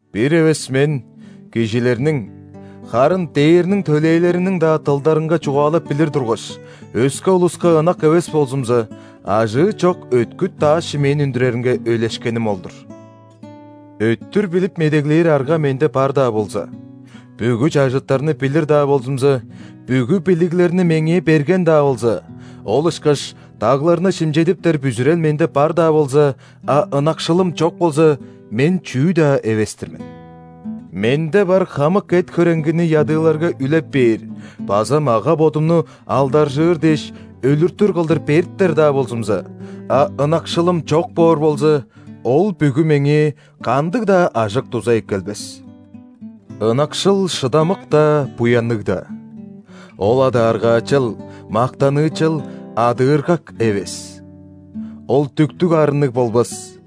Бир эвес мен кижилерниң, харын ·дээрниң төлээлериниң-даа дылдарынга чугаалап билир тургаш, өске улуска ынак эвес болзумза, ажыы чок өткүт дааш-шимээн үндүреринге өйлешкеним ол-дур. Өттүр билип медеглээр арга менде бар-даа болза, бүгү чажыттарны билир-даа болзумза; бүгү билиглерни меңээ берген-даа болза, ол ышкаш дагларны шимчедиптер бүзүрел менде бар-даа болза, а ынакшылым чок болза, мен чүү-даа эвес-тир мен. Менде бар хамык эт-хөреңгини ядыыларга үлеп бээр база мага-бодумну, алдаржыыр дээш, өлүртүр кылдыр бериптер-даа болзумза, а ынакшылым чок боор болза, ол бүгү меңээ кандыг-даа ажык-дуза эккелбес. Ынакшыл шыдамык-даа, буянныг-даа. Ол адааргаачал, мактаныычал, адыыргак эвес. Ол дүктүг арынныг болбас,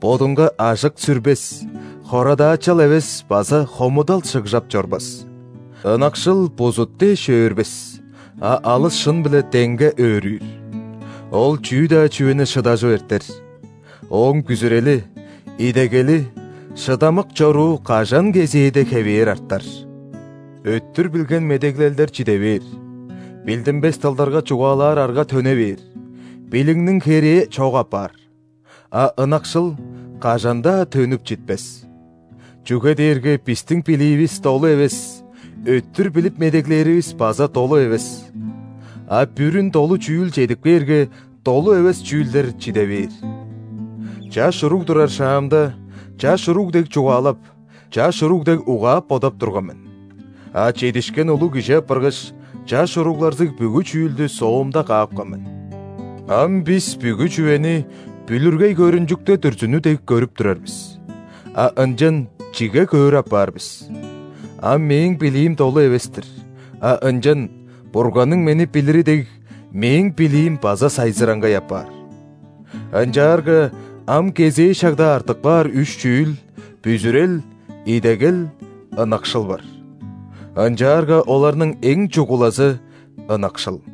бодунга ажык сүрбес, хорадаачал эвес база хомудал шыгжап чорбас. Ынакшыл бузут дээш өөрбес, а алыс шын-биле деңге өөрүүр. Ол чүү-даа чүвени шыдажып эртер. Ооң бүзүрели, идегели, шыдамык чоруу кажан кезээде хевээр артар. Өттүр билген медеглелдер чиде бээр, билдинмес дылдарга чугаалаар арга төне бээр, билигниң херээ чок апаар, а ынакшыл кажан-даа төнүп читпес. Чүге дээрге бистиң билиивис долу эвес, өттүр билип медеглээривис база долу эвес. А бүрүн долу чүүл чедип кээрге, долу эвес чүүлдер чиде бээр. Чаш уруг турар шаамда, чаш уруг дег чугаалап, чаш уруг дег угаап-бодап турган мен. А чедишкен улуг кижи апаргаш, чаш уругларзыг бүгү чүүлдү соомда каапкан мен. Ам бис бүгү чүвени бүлүргей көрүнчүкте дүрзүнү дег көрүп турар бис, а ынчан чиге көөр апаар бис. Ам мээң билиим долу эвес-тир, а ынчан, Бурганның мени билири дег, мээң билиим база сайзыраңгай апаар. Ынчаарга ам кезээ шагда артып каар үш чүүл: бүзүрел, идегел, ынакшыл бар. Ынчаарга оларның эң чугулазы – ынакшыл.